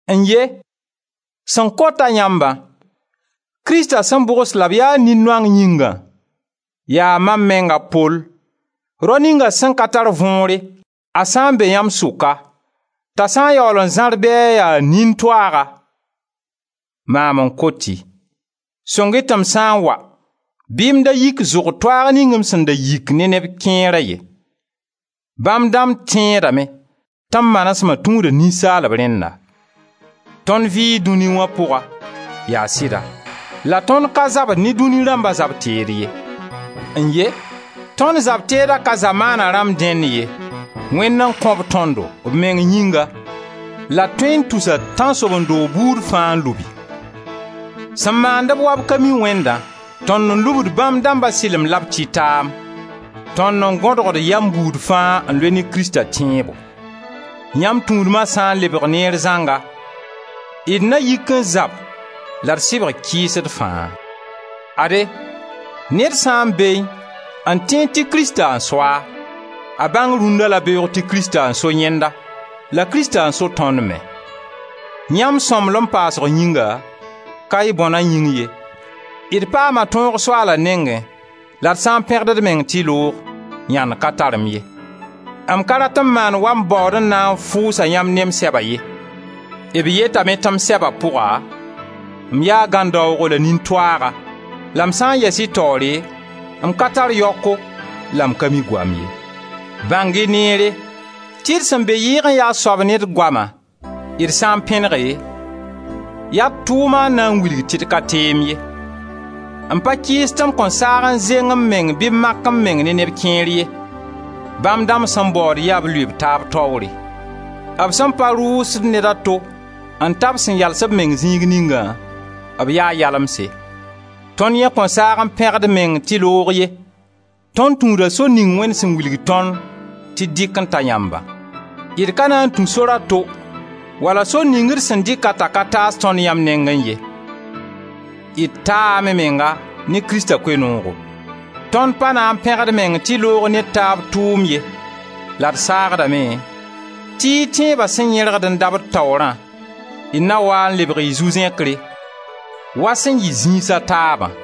N-ye! Sẽn kot-a yãmbã, Krista sẽn bʋgs la b ya nin-noang yĩngã, yaa mam meng a Pol, rao ninga sẽn ka tar võore a sã n be yãmb sʋka, t'a sã n yaool n zãr bɩ a ya nin-toaaga, maam n kot-y: sõng-y tɩ m sã n wa bɩ m da yik zʋg toaag ning m sẽn dat yik ne neb kẽera ye. Bãmb dãmb tẽedame tɩ m manesma tũuda ninsaalb rẽnna. Tõnd vɩɩ dũni wã pʋga, yaa sɩda, la tõnd ka zabd ne dũni rãmba zab-teed ye. N-ye! Tõnd zab-teeda ka zamaana rãmb dẽnd ye, Wẽnd n kõ-b tõndo, b meng yĩnga, la d tõe n tusa tãnsoben-doog buud fãa n lubi. Sẽn maand-b wa b ka mi Wẽndã, tõnd n lubd bãmb dãmba sɩlem la b tɩtaam, tõnd n gõdgd yam buud fãa n loe ne Krista tẽebo. Yãmb tũudma sã n lebg neer zãnga, d na yik n zab la d sɩbg kɩɩsd fãa. Ade, ned sã n beẽ n tẽed tɩ Krista n so-a, a bãng rũnna la beoog tɩ Krista n so yẽnda, la Krista n so tõnd me. Yãmb sõmblem paasg yĩnga, ka y bõna yĩng ye, d paama tõog Soaala nengẽ la d sã n pẽgd d meng tɩ loog, yãnd ka tar m ye. M ka rat n maan wa m baood n na n fʋʋsa yãmb ne m sɛba ye. B yetame tɩ m sɛba pʋga m yaa gãndaoogo la nin-toaaga la m sã n yɛs y taoore m ka tar yaoko la m ka mi goam ye. Bãng-y nere tɩ d sẽn be yɩɩg n ya a soab ne d goama, d sã n pẽnege, yaa d tʋʋma n na n wilg tɩ d ka teem ye. M pa kɩɩs tɩ m kõn saag n zeng m meng bɩ m mak m meng ne neb kẽer ye. Bãmb dãmb sẽn baood yaa b lʋɩ b taab taoore. B sẽn pa rʋʋsd ned a to n ta b sẽn yals b meng zĩig ningã, b yaa yalemse. Tõnd yẽ kõn saag n pẽg d meng tɩ loog ye. Tõnd tũuda sor ning Wẽnd sẽn wilg tõnd tɩ d dɩk n ta yãmbã. D ka na n tũ sor a to wala sor ning d sẽn dɩka ka taas tõnd yãmb nengẽ ye. D taame menga ne Krista Koe-noogo. Tõnd pa na n pẽg d meng tɩ loog ne d taab tʋʋm ye la d saagdame tɩ y tẽeba sẽn yẽrgd n dabd taoorã, d na waa n lebg y zu-zẽkre wa sẽn yɩ zĩisa taabã.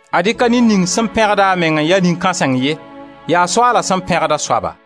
Ad-y ka ned ning sẽn pẽgd a meng n ya nin-kãseng ye, yaa Soaala sẽn pẽgd a soaba.